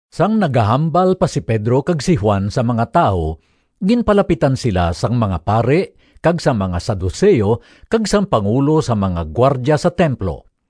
Sang nagahambal pa si Pedro kag si Juan sa mga tawo, ginpalapitan sila sang mga pari kag sang mga Saduceo kag sang pangulo sang mga gwardya sa templo.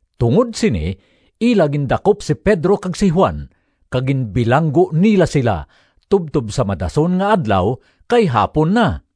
Tungod sini ila gindakop si Pedro kag si Juan, kag ginbilanggo nila sila tubtob sa madason nga adlaw, kay hapon na.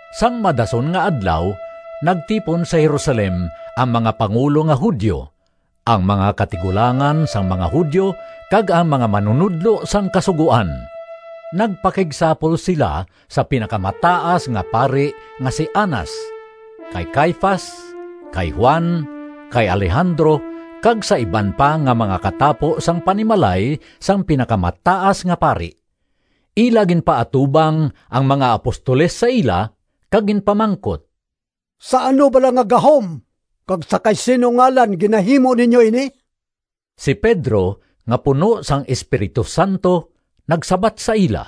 Sang madason nga adlaw nagtipon sa Jerusalem ang mga pangulo nga Judio, ang mga katigulangan sang mga Judio kag ang mga manunodlo sang Kasugoan. Nagpakigsapol sila sa Pinakamataas nga Pari nga si Anas, kay Caifas, kay Juan, kay Alejandro kag sa iban pa nga mga katapo sang panimalay sang Pinakamataas nga Pari. Ila ginpaatubang ang mga apostoles sa ila kag ginpamangkot, “Sa ano bala nga gahom kag sa kay sin-o ngalan ginahimo ninyo ini?” Si Pedro nga puno sang Espiritu Santo nagsabat sa ila,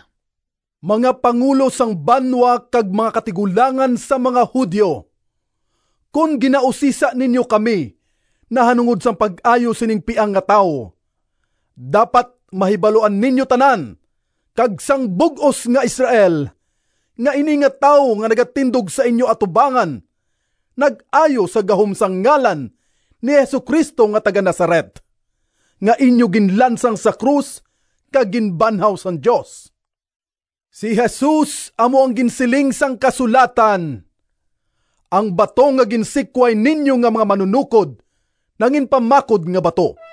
“Mga pangulo sang banwa kag mga katigulangan sang mga Judio, kon ginausisa ninyo kami nahanungod sang pag-ayo sining piang nga tawo, dapat mahibaluan ninyo tanan kag sang bug-os nga Israel, nga ini nga tawo nga nagatindog sa inyo atubangan, nag-ayo sa gahom sang ngalan ni Jesu-Cristo nga taga-Nazaret, nga inyo ginlansang sa krus kag ginbanhaw sang Dios. Si Jesus amo ang ginsiling sang kasulatan: ‘Ang bato nga ginsikway ninyo Nga mga manunokod Nanginpamakod nga bato.’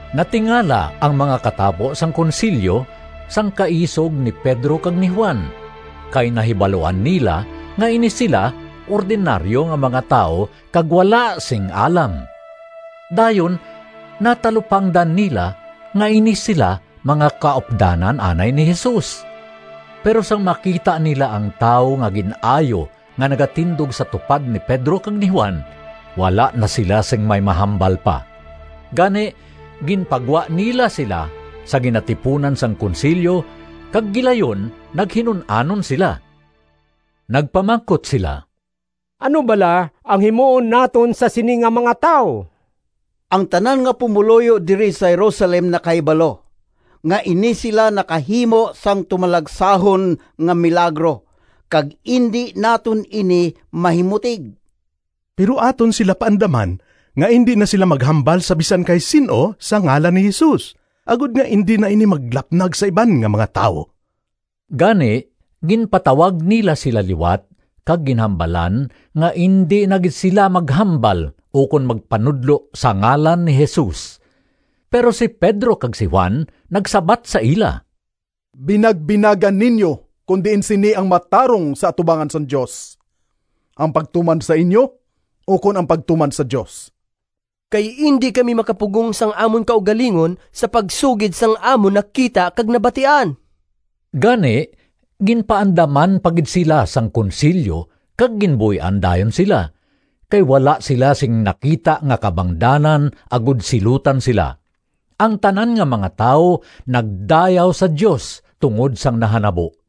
Natingala ang mga katapo sang Konsilyo sang kaisog ni Pedro kag ni Juan kay nahibaluan nila nga ini sila ordinaryo nga mga tawo kag wala sing alam. Dayon natalupangdan nila nga ini sila mga kaupdanan anay ni Jesus. Pero sang makita nila ang tawo nga gin-ayo nga nagatindog sa tupad ni Pedro kag ni Juan, wala na sila sing may mahambal pa. Gani ginpagwa nila sila sa ginatipunan sang Konsilyo kag gilayon naghinun-anon sila. Nagpamangkot sila, “Ano bala ang himuon naton sa sini nga mga tawo? Ang tanan nga pumoluyo diri sa Jerusalem nakahibalo nga ini sila nakahimo sang tumalagsahon nga milagro kag indi naton ini mahimutig. Pero aton sila paandaman nga indi na sila maghambal sa bisan kay sin-o sa ngalan ni Jesus, agod nga indi na ini maglapnag sa iban nga mga tawo.” Gani ginpatawag nila sila liwat kag ginhambalan nga indi na gid sila maghambal ukon magpanudlo sa ngalan ni Jesus. Pero si Pedro kag si Juan nagsabat sa ila, “Binagbinaga ninyo kon diin sini ang matarong sa atubangan sang Dios: ang pagtuman sa inyo ukon ang pagtuman sa Dios. Kay indi kami makapugong sang amon kaugalingon sa pagsugid sang amon nakita kag nabatian.” Gani ginpaandaman pa gid sila sang Konsilyo kag ginbuy-an dayon sila, kay wala sila sing nakita nga kabangdanan agod silutan sila. Ang tanan nga mga tawo nagdayaw sa Dios tungod sang nahanabo.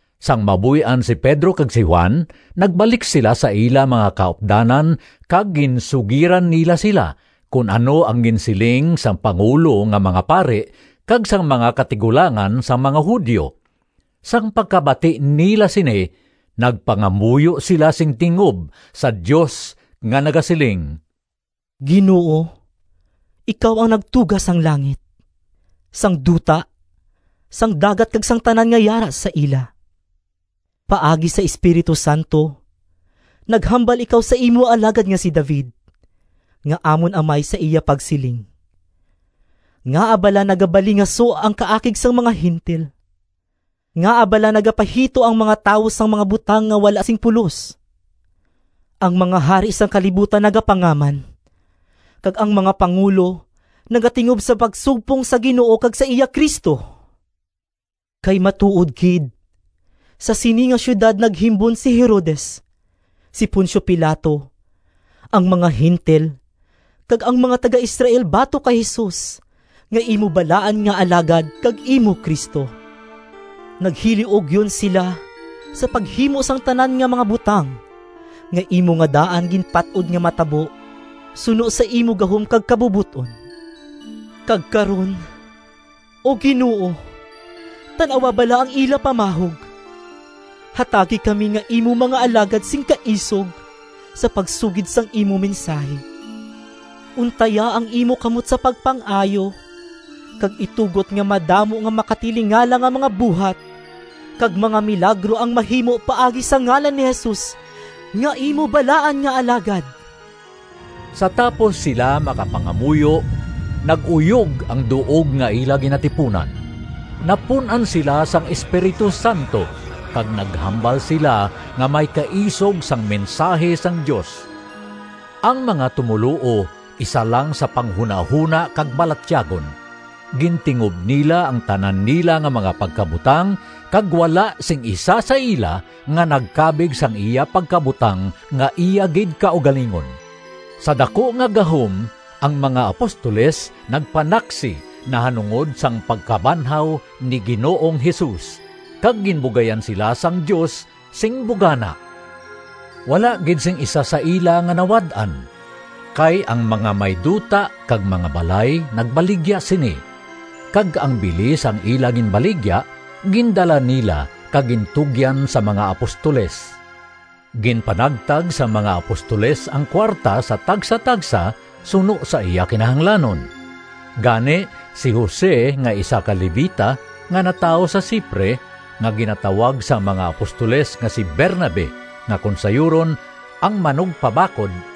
Sang mabuy-an si Pedro kag si Juan, nagbalik sila sa ila mga kaupdanan kag ginsugiran nila sila kon ano ang ginsiling sang pangulo nga mga pari kag sang mga katigulangan sang mga Judio. Sang pagkabati nila sini nagpangamuyo sila sing tingob sa Dios nga nagasiling, “Ginoo, ikaw ang nagtuga sang langit, sang duta, sang dagat kag sang tanan nga yara sa ila! Paagi sa Espiritu Santo naghambal ikaw sa imo alagad nga si David nga amon amay sa iya pagsiling: ‘Ngaa bala nagabalingaso Ang kaakig sang mga Gentil, Ngaa bala nagapahito ang mga tawo Sang mga butang nga wala sing pulos? Ang mga hari sang kalibutan Nagapangaman, Kag ang mga pangulo nagatingob Sa pagsumpong sa Ginoo Kag sa iya Cristo.’ Kay matuod gid, sa sini nga siyudad naghimbon si Herodes, si Poncio Pilato, ang mga Gentil kag ang mga taga-Israel batok kay Jesus nga imo balaan nga Alagad kag imo Cristo. Naghiliugyon sila sa paghimo sang tanan nga mga butang nga imo nga daan ginpat-od nga matabo suno sa imo gahom kag kabubot-on. Kag karon, O Ginoo, tan-awa bala ang ila pamahog. Hatagi kami nga imo mga alagad sing kaisog sa pagsugid sang imo mensahi. Untaya ang imo kamot sa pagpang-ayo, kag itugot nga madamo nga makatilingala nga mga buhat kag mga milagro ang mahimo paagi sa ngalan ni Jesus nga imo balaan nga Alagad.” Sa tapos sila makapangamuyo, nag-uyog ang duog nga ila ginatipunan. Napun-an sila sang Espiritu Santo kag naghambal sila nga may kaisog sang mensahi sang Dios. Ang mga tumoluo isa lang sa panghunahona kag balatyagon. Gintingob nila ang tanan nila nga mga pagkabutang, kag wala sing isa sa ila nga nagkabig sang iya pagkabutang nga iya gid kaugalingon. Sa daku nga gahom ang mga apostoles nagpanaksi nahanungod sang pagkabanhaw ni Ginoong Jesus, kag ginbugayan sila sang Dios sing bugana. Wala gid sing isa sa ila nga nawad-an. Kay ang may mga duta kag mga balay nagbaligya sini, kag ang bili sang ila ginbaligya gindala nila kag gintugyan sa mga apostoles. Ginpanagtag sang mga apostoles ang kuwarta sa tagsatagsa suno sa iya kinahanglanon. Gani si Jose nga isa ka Levita nga natawo sa Cipre, nga ginatawag sang mga apostoles nga si Bernabe nga kon sayuron, “Ang Manugpabakod,”